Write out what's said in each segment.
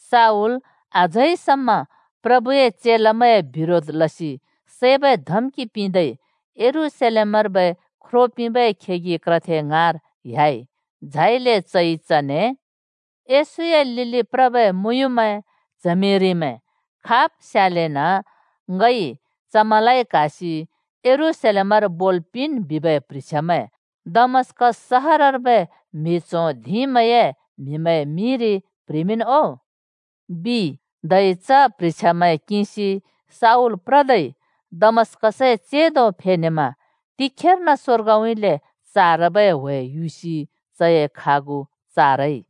शाऊल अझै समा प्रभुए चेलामैंए बिरोध लसि सैबै धम्कि लदै यरूशलेमर्बै ख्रो पिंबै खेगि क्रथे ङाँर ह्‍याइ। झाइले चइ चने “येशूए लिलि प्रबै मुँयुँमैं-च्हमिरिमैं खाब् स्यालेन ङइ चमैंलाइ क्‍हासि यरूशलेमर बोल् पिंन् बिबै प्ह्रिछ्यामैं दमस्‍कस सहरर्बै म्हि च्हों धिंमैंए म्हिमैंए मिंरि प्ह्रिमिंन् ओ,” बिइ। धै च प्ह्रिछ्यामैं किंसि शाऊल प्रदै दमस्कसए चेंदो फेनेमा तिखेर्न स्वर्गउँइँले चारबै ह्‍वे युसि चए खागु चारइ।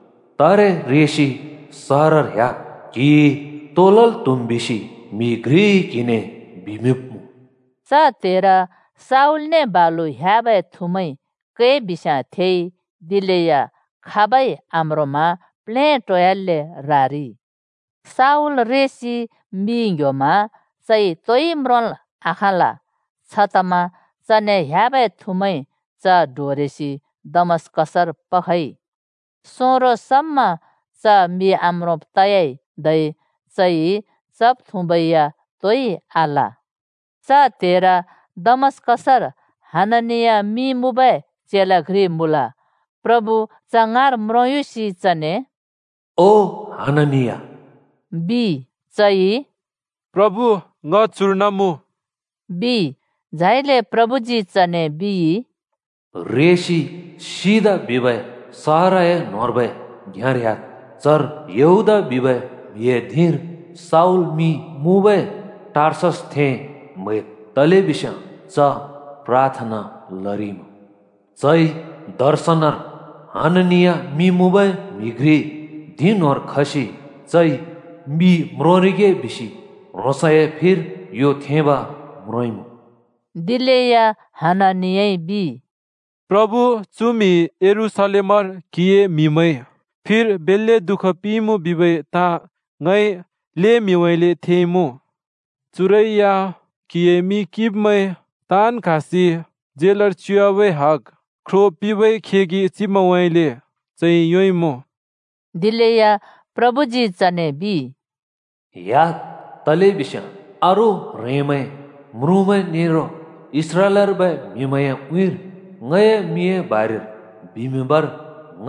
तारे रेसि सहरर ह्‍याद्, क्‍हिइ तो लल् त्‍हुम् बिसि म्हि घ्रिइ क्हिने बिमिंब्‍मुँ।” च त्हेर शाऊलने बालु ह्‍याबै थुमैंइ कै बिस्याँ थेइ, दिलेया खाबै आम्रोंमा प्लेटोयाल्‍ले रारिइ। शाऊल रेसि मि ङ्‍ह्‍योमा चइ तोइ म्रोंल आखाँल। छतमा चने ह्‍याबै थुमैंइ च डोरेसि दमस्कसर पखइ। सोंरो समा च मि आम्रोंब् तयाइ, धै चइ चब्-थुँब या तोइ आल। च त्हेर दमस्‍कसर हननिया मिं मुँबै चेला घ्रि मुँल। प्रभु च ङाँर म्रोंयुसि चने “ओ हननिया,” बिइ। चइ “प्रभु, ङ चुर्न मुँ,” बिइ। झाइले प्रभुजी चने बिइ, “रेसि ‘सिधा’ बिबै सहरए न्होंर्बै घ्याँर ह्‍याद्। चर यहूदा बिबै म्हिए धिंर शाऊल मिं मुँबै टार्ससथें म्हैद्। तलेबिस्याँ च प्राथना लरिइमुँ। चइ दर्शनर हननिया मिं मुँबै म्हि घ्रि धिं न्होंर खसि चइ मि म्रोंरिगे बिसि ह्रोंसए फिर यो थेंब म्रोंइँमुँ।” दिलेया हननियाइ बिइ, “प्रभु, चु म्हिइ यरूशलेमर क्‍हिए म्हिमैं फिर बेल्‍ले दुःख पिंइँमुँ बिबै ताँ ङइ ल्हें म्हिउँइँले थेइमुँ। चुरै या क्हिए मिं किंब्मैं ताँन् क्हासि झेलर च्युवाबै हग ख्रो पिंबै खेगि चिब्मैंउँइँले चइ योंइँमुँ।” दिलेया प्रभुजी चने बिइ, “ह्‍याद्, तलेबिस्याँ अरू ह्रेंमैं, म्रुँमैं नेरो इस्राएलर्बै म्हिमैंए उँइँर ङए मिंए बारेर बिमिंबर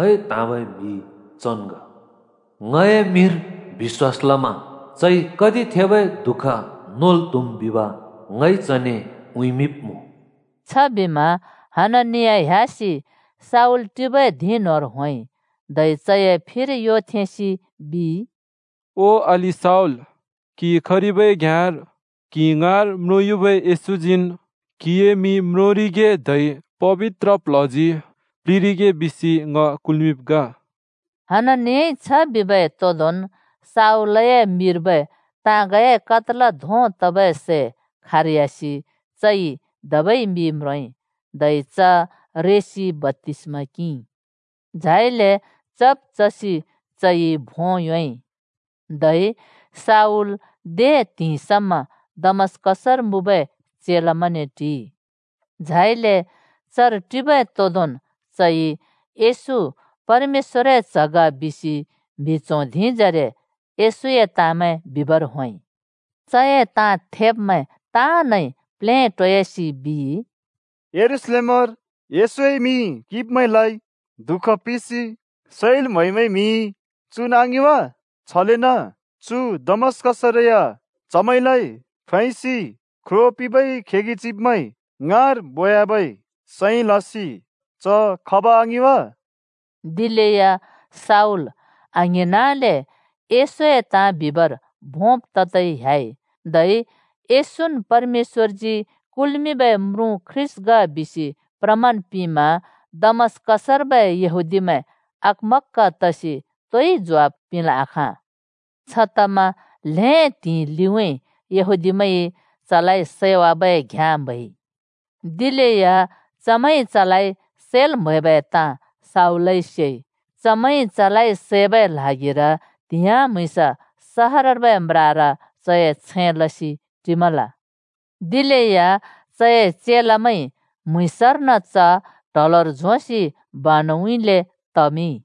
ङइ त्हाँबै म्हि चन् ग। ङए मिंर बिश्‍वास लमा चइ कति थेबै दुःख नोल् त्हुम् बिब ङइ चने उँइँमिंब्मुँ।” छबिमा हननिया ह्‍यासि शाऊल टिबै धिं न्होंर होंइ। धै चए फिर यो थेंसि बिइ, “ओ अलि शाऊल, क्हि खरिबै घ्याँर क्हि ङाँर म्रोंयुबै येशूजीन् क्हिए मि म्रोंरिगे धै पबित्र प्ल्हजी प्लिंरिगे बिसि ङ कुल्मिंब् ग।” हननियाइ छ बिबै तोंदोंन् शाऊलए मिर्बै ताँगए कत्‍ला धों तबै सै खारयासि चइ धबै मि म्रोंइ। धै च रेसि बप्‍तिस्मा किंइ। झाइले चब् चसि चइ भों योंइ। धै शऊल दे त्हिंइ समा दमस्‍कसर मुँबै चेलामैंने टिइ। झाइले चर टिबै तोंदोंन् चइ येशू परमेश्‍वरए च्ह ग बिसि म्हि च्हों धिंजरे येशूए ताँमैं बिबर होंइ। चए ताँ थेब्मैं ताँनइ प्लेटोयासि बिइ, “यरूशलेमरि येशूए मिं किंब्मैंलाइ दुःख पिंसि सैल् म्हैबै म्हि चुन् आङिं वा? छलेन चु दमस्‍कसरै या चमैंलाइ फैसि ख्रो पिंबै खेगि चिब्मैं ङाँर बोयाबै सैं लसि च खब आङिं वा?” दिलेया शाऊल आङ्हिंनले येशूए ताँ बिमिंबर भोंब् ततै ह्‍याइ, धै येशून् परमेश्‍वरजी कुल्मिंबै म्रुँ ख्रीष्‍ट ग बिसि प्रमाण पिंमा दमस्कसर्बै येहूदिमैंइ अकमक्‍क तसि तोइ ज्वाफ पिंल् आखाँ। छतमा ल्‍हें त्हिंइ लिउँइँ यहूदीमैंइ चलाइ सैवाबै घ्याँ म्हैइ। दिलेया चमैंइ चलाइ सैल् म्हैबै ताँ शाऊलइ सेइ। चमैंइ चलाइ सैबै ल्हागिर त्हिंइ म्‍हुँइँस सहरर्बै म्रार चए छैं लसि टिमल। दिलेया चए चेलामैंइ म्‍हुँइँसर्न च ट्हलर झोंसि बानुउँइँले तमिंइ।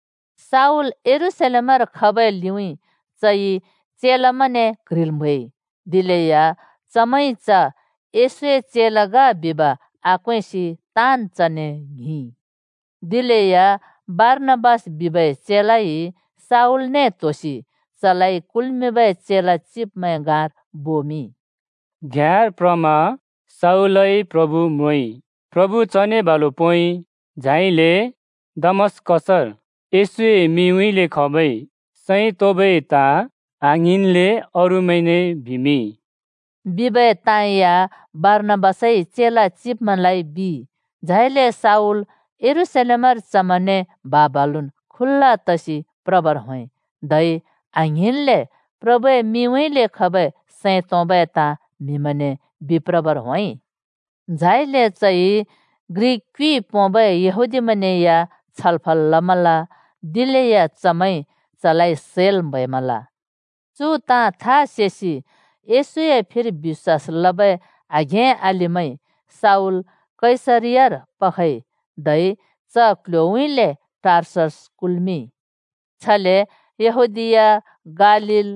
शाऊल यरूशलेमर खबै लिउँइँ चइ चेलामैंने क्ह्रिल् म्हैइ। दिलेया चमैंइ च येशूए चेला ग बिब आक्वेंसि ताँन् चने ङ्हिंइ। दिलेया बारनाबास बिबै चेलाइ शावल त्होसि चलाइ कुल्मिंबै चेला चिब्मैं ङाँर बोमिंइ। “घ्याँर प्रमा शाऊलइ प्रभु म्रोंइ, प्रभु चने बालु पोंइ, झाइले दमस्कसर येशूए मिंउँइँले खबै सैं तोंबै ताँ आङ्हिंन्ले अरूमैंने बिमिंइ,” बिबै ताँ या बारनाबासइ चेला चिब्मैंलाइ बिइ। झाइले शाऊल यरूशलेमर चमैंने बा-बालु खुल्‍ल तसि प्रबर होंइ, धै आङ्हिंन्ले प्रभुए मिंउँइँले खबै सैं तोंबै ताँ म्हिमैंने बिप्रबर होंइ। झाइले चइ ग्रिक क्युइ पोंबै यहूदीमैंने या छलफल लमल, दिलेया चमैंइ चलाइ सैल् म्हैमल। चु ताँ था सेसि येशूए फिर बिश्‍वास लबै आघें-अलिमैंइ शाऊल कैसरियार पखइ, धै च क्ल्ह्‍योउँइँले टार्ससर कुल्मिंइ। छले यहूदीया, गालील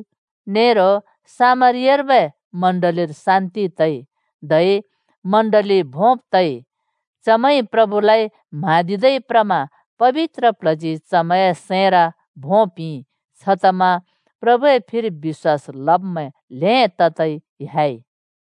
नेरो सामरियार्बै चर्चर शान्ति तइ धै चर्च भोंब् तइ। चमैंइ प्रभुलाइ म्हाँदिदै प्रमा पबित्र प्ल्हजी चमैंए सैंर भों पिंइ। छतमा प्रभुए फिर बिश्‍वास लब्मैं ल्हें ततै ह्‍याइ।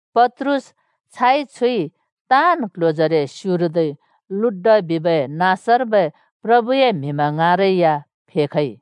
पत्रुस छाइछुइ ताँन् क्ल्ह्‍योजरे स्युरदै लुड्डा बिबै नाँसर्बै प्रभुए म्हिमैं ङाँरै या फेखइ।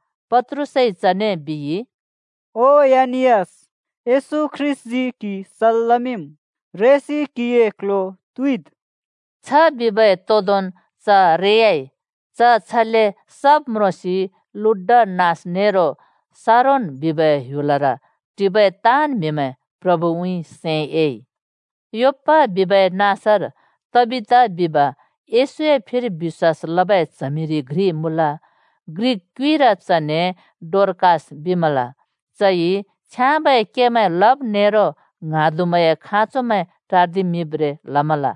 पत्रुसइ चने बिइ, “ओ एनियास! येशू ख्रीष्‍टजी क्‍हि सल् लमिंम्। रेसि क्हिए क्‍ल्ह्‍यो त्युइद्।” छ बिबै तोंदोंन् च रेयाइ। च छले सब् म्रोंसि लुड्डा नाँस नेरो शारोन बिबै ह्‍युलर टिबै ताँन् म्‍हिमैं प्रभुउँइँ सैं एइ। योप्‍पा बिबै नाँसर तबिता बिब येशूए फिर बिश्‍वास लबै च्हमिरि घ्रि मुँल। ग्रिक क्युइर चने डोरकास बिमल। चइ छ्याँबै केमैं लब् नेरो ङ्हाँदुमैंए खाँचोमैं टार्दिमिंब्रें लमल।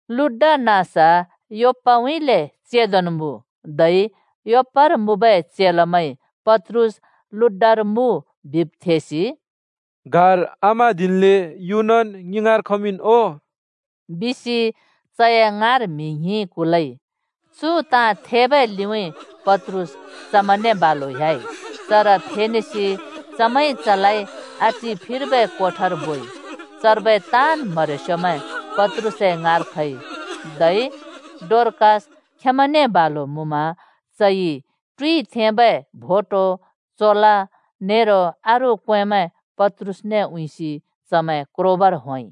लुड्डा नाँस योप्पाउँइँले चेंदोन् मुँ, धै योप्पार मुँबै चेलामैंइ पत्रुस लुड्डार मुँ बिब् थेसि, “गाह्र आम्हाँदिन्ले युनन् ङि ङाँर खमिंन् ओ,” बिसि चए ङाँर म्हि ङ्हिं कुलइ। चु ताँ थेबै लिउँइँ पत्रुस चमैंने बालु ह्‍याइ। चर फेनेसि चमैंइ चलाइ आटि फिर्बै कोठार बोइ। चर्बै ताँन् म्हरेस्योमैं पत्रुसए ङाँर खइ, धै डोरकास खेंमैंने बालु मुँमा चइ टुइ थेंबै भोटो, चोला नेरो अरू क्वेंमैं पत्रुसने उँइँसि चमैं क्रोबर होंइ।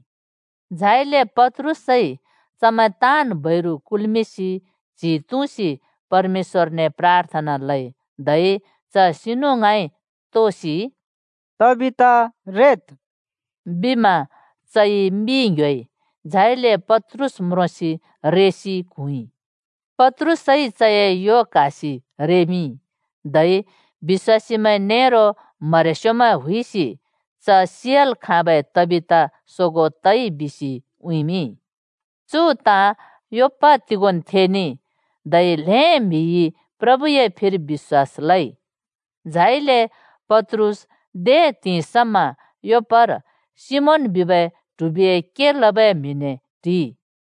झाइले पत्रुसइ चमैं ताँन् बैरु कुल्मिंसि च्हि तुँसि परमेश्‍वरने प्राथना लइ। धै च सिनु ङाँइ तोसि, “तबिता, रेद्!” बिमा चइ मि ङ्‍ह्‍योइ, झाइले पत्रुस म्रोंसि रेसि क्हुँइ। पत्रुसइ चए यो क्हासि रेमिंइ, धै बिश्‍वासीमैं नेरो म्हरेस्योमैं हुइसि च सियाल् खाँबै तबिता सोगों तइ बिसि उँइँमिंइ। चु ताँ योप्‍पा तिगोंन् थेनेइ, धै ल्हें म्हिइ प्रभुए फिर बिश्‍वास लइ। झाइले पत्रुस दे त्हिंइ समा योप्पार सिमोन बिबै ट्हिबिए के लबै म्हिने टिइ।